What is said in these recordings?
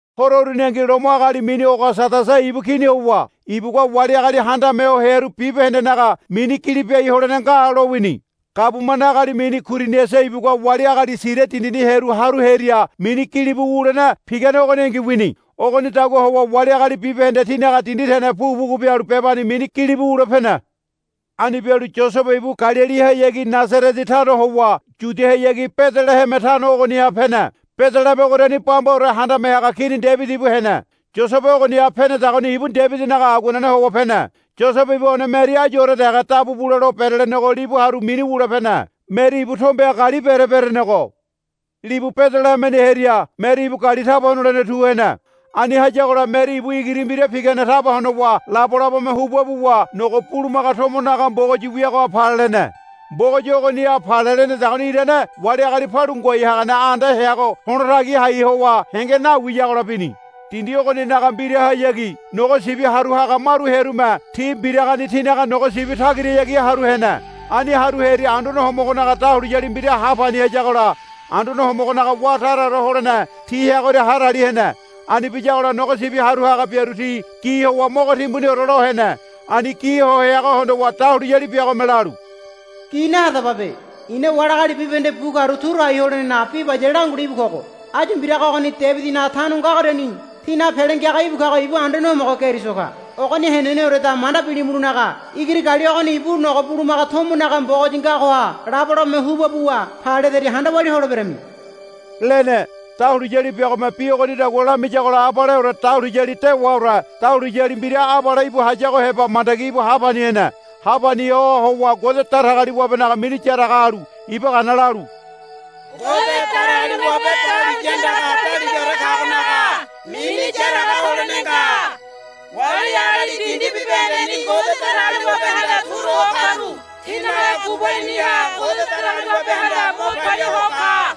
Horo uruningi Lomo agali mini Ogasadasa ibu Kini howa ibugua wali agali handame ho hearu bibahendenaga mini gili biai holene nga lowini. Gabumane agali mini Kuiriniasa ibugua wali agali Siria dindini hearu haru hearia mini gilibu wulene pigane ogoningi wini. Ogonidagua howa wali agali bibahende tinaga dindi tene pugu pugu bialu bebani mini gilibu wule pene. Ani bialu Yosebe ibu Galilihayagi Nasarete tano howa Yudiahayagi Bedeleheme tano ogoniha pene. Bedeleheme ogoriani bambaore handame haga Kini Debidi ibu hene. Yosebe ogoniha penedagoni ibu Debidinaga aguanene howa pene. Yosebe ibu one Meri ayuore dege dabu bule lo berelenego libu haru mini wule pene. Meri ibu tombeha gali bere berenego libu Bedelehemeni hearia Meri ibu gali taba honolene tu hene. Ani hayagola Meri ibu igiri mbira pigane taba honowa labolabome huba buwa nogo bulumaga tomo naga mbogoyi wiagoha pale lene. Mbogoyi ogoniha pale lenedagoni irane wali agali palu ngoai hagane anda heago to̱la tagi hai howa henge nawiyagola bini. Dindi ogoninaga mbirahayagi nogo sibi haru haga maru hearume ti mbiragani tinaga nogo sibi tagirahayagi haru hene. Ani haru hearia Anduane Homogonaga dahuliyali mbira ha pani hayagola Anduane Homogonaga wá taraore holene ti heagoria hadali hene. Ani biyagola nogo sibi haru haga biaru ti gi howa mogo timbuniore lo hene. Ani gi ho heago hondowa dahuliyali biagome lalu, Gi nahadababe. I̱na wali agali bibahende bu karu turu hai holenenaga bi bayale langule íbu kogo. Áyu mbiraga ogoni Debidinaga tano ngagoriani tínaga Pele Ngiaga íbu kago ibu Anduane Homogo Keriso ka. Ogoni heneneoreda manda bilimulonaga igiri gali ogoni ibu nogo bulumaga tomo naga mbogoyi ngagoha labolabome huba buwa pale ledaria handa walia holeberami, lene. Dahuliyali biagome bi ogonidagua lamiyagola abaleore dahuliyali dewaore dahuliyali mbira abale íbu hayago heba mandagi ha pani hene. Ha pani ho howa Ngode Datagaliwabenaga mini yaraga halu iba gana lalu, Ngode Datagaliwabe dahuliya andaga daligaore kagonaga mini yaraga holene nga. Wali agali dindi bibahendeni Ngode Datagaliwabehanda turu ho karu tinaga gubaliniha Ngode Datagaliwabehanda mo palia ho ka,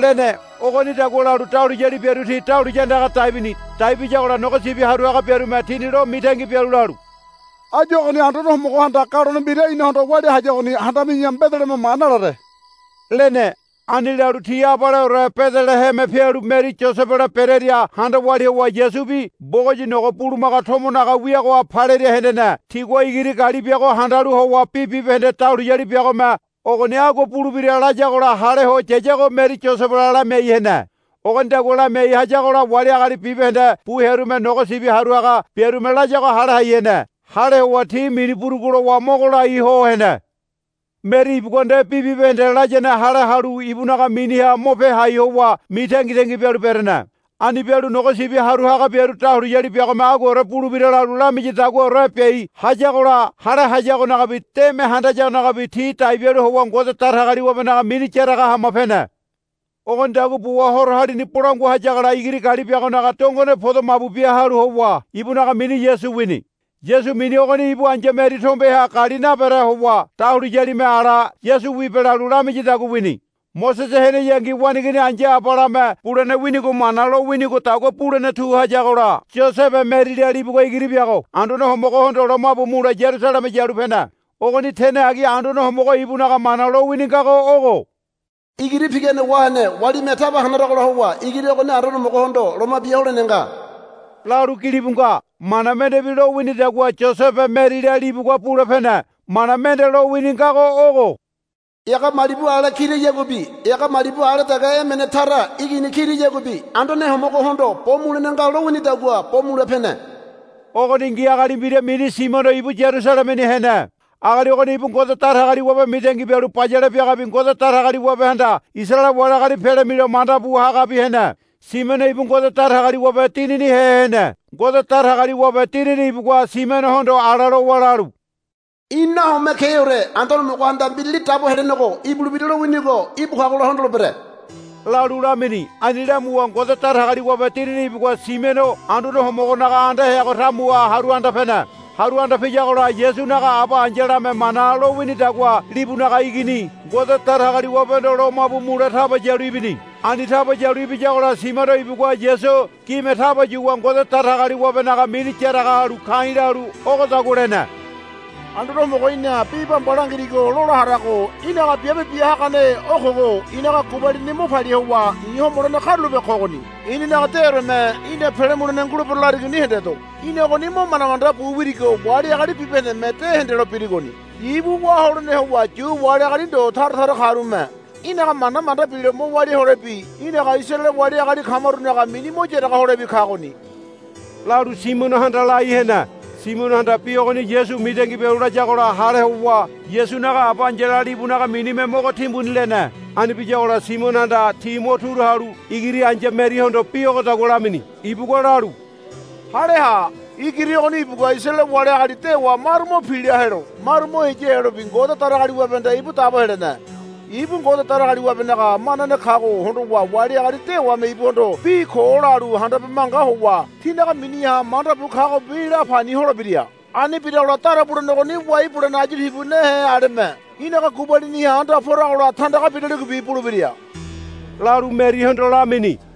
lene. Ogonidagua lalu dahuliyali biaru ti dahuliya andaga dai bini. Dai biyagola nogo sibi haru haga biarume tini lo mitangi bialu lalu, Áyu ogoni Anduane Homogohanda galone mbira inahondo walia hayagoni handami̱ya Bedeleheme ma nalare, lene. Ani lalu ti abaleore Bedeleheme pialu Meri Yosebela berearia handa walia howa Yasubi mbogoyi nogo bulumaga tomo naga wiagoha paleria hendene. Tigua igiri gali biago handalu howa bi bibahende dahuliyali biagome ogoni agua bulebira layagola hale ho yayago Meri Yosebela lamiai hene. Ogonidagua lamiai hayagola wali agali bibahende bu hearume nogo sibi haru haga biarume layago hale hai hene. Hale howa ti mini burugu lowa mogo lai ho hene. Meri ibugua nde bi bibahende layane hale halu ibunaga miniha mo pe hai howa mitangitangi bialu berene. Ani bialu nogo sibi haru haga biaru dahuliyali biagome aguaore bulebira lalu lamiyadaguaore biai hayagola hale hayagonagabi deme handayagonagabi ti dai bialu howa Ngode Datagaliwabenaga mini yaraga hama pene. Ogonidagua buwa horo halini bolangua hayagola igiri gali biagonaga dongone podo mabu bia halu howa ibunaga mini Yasu wini. Yasu mini ogoni ibu ai̱ya Meri tombeha gali nabere howa dahuliyalime ala, Yasu wibe, lalu lamiyadagua wini. Mosese heneyangi waneigini ai̱ya abalame bulene winigo Mana lowinigodagua bulene tu hayagola Yosebe Merila libugua igiri biago Anduane Homogohondo lomabu mule Yarusaleme yalu pene. Ogoni tene agi Anduane Homogo ibunaga mana lowini ngago ogo, Igiri pigane wahene walime taba hanaragola howa igiri ogoni Anduane Homogohondo loma bia holene nga, lalu gilibu nga. Mana mendebi lowinidagua Yosebe Merila libugua bule pene. Mana mende lowini ngago ogo, Ega malibu ale kirayaguabi ega malibu ale dege emene tara igini kirayaguabi Anduane Homogohondo bo mulene nga lowinidagua bo mule pene. Ogoningi agali mbira mini Simiono ibu Yarusalemeni hene. Agali ogoni ibu Ngode Datagaliwabe mitangi bialu bayale biagabi Ngode Datagaliwabehanda Isaraele wali agali pele milo manda bu hagabi hene. Simiono ibu Ngode Datagaliwabe Dininihe hene. Ngode Datagaliwabe Dinini ibugua Simionohondo ala lowa lalu, Í̠ nahome keore Anduane Homogohanda Mbirali Dabo Helenego ibulebira lowinigo íbu kagola hondolebere, lalu lamini. Ani lamuwa Ngode Datagaliwabe Dinini ibugua Simiono Anduane Homogonaga anda heago tamuha haru anda pene. Haru anda piyagola Yasunaga aba ai̱yalame Mana lowinidagua libunaga igini Ngode Datagaliwabehondo lomabu mule taba yalu ibini. Ani taba yalu ibiyagola Simiono ibugua Yasu gime taba yuwa Ngode Datagaliwabenaga mini yaraga halu ka̱i̱ lalu ogodagua lene. Anduane Homogo í̠na bi bamba langirigo lola harago í̠naga biabe bia hagane o kogo i̱naga gubalini mo palia howa i̱ homolene karulape kogoni. I̱ninaga deoreme í̠na pele mulene ngulebero larigoni hendedo. Í̠na ogoni mo manda manda bu wirigo wali agali bibahendeme de hendelo birigoni. Ibu wá holene howa Yu wali agali ndo tara tara karume í̠naga mana manda bilo mo walia holebi í̠naga Isaraele wali agali kamarunaga mini mo yaraga holebi kagoni, lalu Simionohanda lai hene. Simionohanda bi ogoni Yasu mitangi bialu layagola hale howa Yasunaga aba ai̱yala libunaga minime mogo timbuni lene. Ani biyagola Simionohanda ti mo turu halu igiri ai̱ya Merihondo bi ogodagua lamini. Ibugua lalu, Hale ha. Igiri ogoni ibugua Isaraele wali agali dewa maru mo pila helo maru mo heya helobi Ngode Datagaliwabehanda ibu dabo helene. Ibu Ngode Datagaliwabenaga manane kago hondowa wali agali dewame ibuhondo bi ko lalu handabe manga howa tinaga miniha manda bu kagobi la pani holebira. Ani biragola dara bulene ogoni wai bulene ayu tibu nehe aleme í̠naga gubaliniha anda poragola tandaga biraligobi bulebira, lalu Merihondo lamini.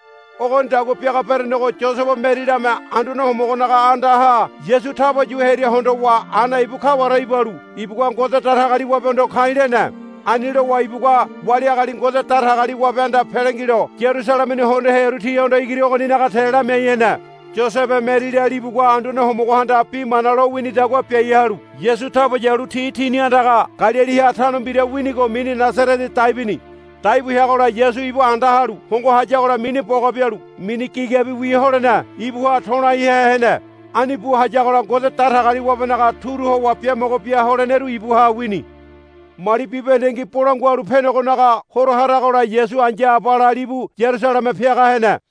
Ogonidagua biaga berenego Yosebe Merilame Anduane Homogonaga andaha Yasu taba yu hearia hondowa Ana ibu kaware ibalu ibugua Ngode Datagaliwabehondo ka̱i̱ lene. Ani lowa ibugua wali agali Ngode Datagaliwabehanda pele ngilo Yarusalemeni hondo hearu tihondo igiri ogoninaga te lamiai hene. Yosebe Merila libugua Anduane Homogohanda bi mana lowinidagua biai halu Yasu taba yalu ti tini andaga Galiliha tano mbira winigo mini Nasarete dai bini. Dai bu heagola Yasu ibu anda halu hongo hayagola mini boga bialu mini gigabiwi holene ibuha to̱ laihe hene. Ani bu hayagola Ngode Datagaliwabenaga turu howa biamogo bia holeneru ibuha wini. Mali bibahendengi Bolangua Halu Penegonaga Horo haragola Yasu ai̱ya abala libu Yarusaleme piaga hene.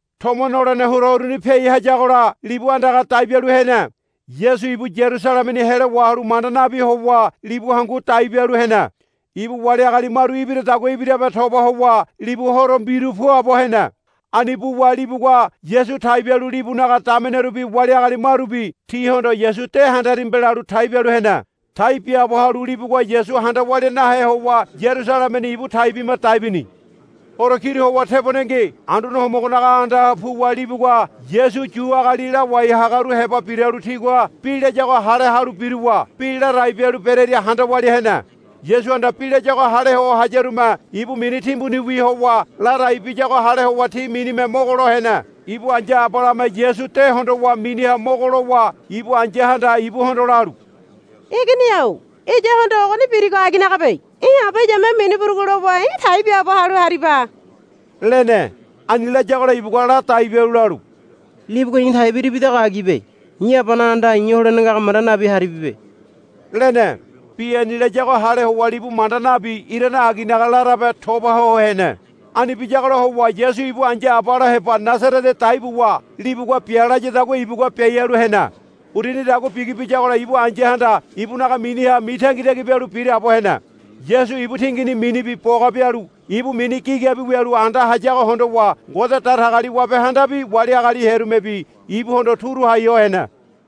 Tomo nolene horo uruni piai hayagola libu andaga dai bialu hene. Yasu ibu Yarusalemeni helo wahalu manda nabi howa libu hangu dai bialu hene. Ibu wali agali maru ibiradagua ibirabe toba howa libu horo mbiru puabo hene. Ani buwa libugua Yasu tai bialu libunaga damenerubi wali agali marubi tihondo, Yasu de handarimibe, lalu tai bialu hene. Tai biaabo halu libugua Yasu handa walia nahe howa Yaruselemeni ibu tai bima dai bini. Horo kiru howa tebonengi Anduane Homogonaga andaha puwa libugua Yasu Yu agali lawai hagaru heba biralu tigua bi layago hale halu biruwa bi ladai bialu berearia handa walia hene. Yasuhanda bi layago hale ho hayarume ibu mini timbuniwi howa ladai biyago hale howa ti minime mogo lo hene. Ibu ai̱ya abalame Yasu de hondowa miniha mogo lowa ibu ai̱yahanda ibuhondo lalu, Igini-o iyahondo ogoni birigo aginagabe. Í̠ aba iyame mini burugu lowa í̠ tai biaabo halu hariba, lene. Ani layagola ibugua ladai bialu lalu, Libugua i̱ tai biribidago agibe. I̱ Abanaga andaha i̱ holene ngago manda nabi haribibe, lene. Bi ani layago hale howa libu manda nabi irane aginaga larabe toba ho hene. Ani biyagola howa Yasu ibu ai̱ya abala heba Nasarete dai buwa libugua bia layadagua ibugua biai halu hene. Urunidagua bigi biyagola ibu ai̱yahanda ibunaga miniha mitangitangi bialu biraabo hene. Yasu ibu tingini minibi boga bialu ibu mini gigabi wialu anda hayago hondowa Ngode Datagaliwabehandabi wali agali hearumebi ibuhondo turu hai ho hene.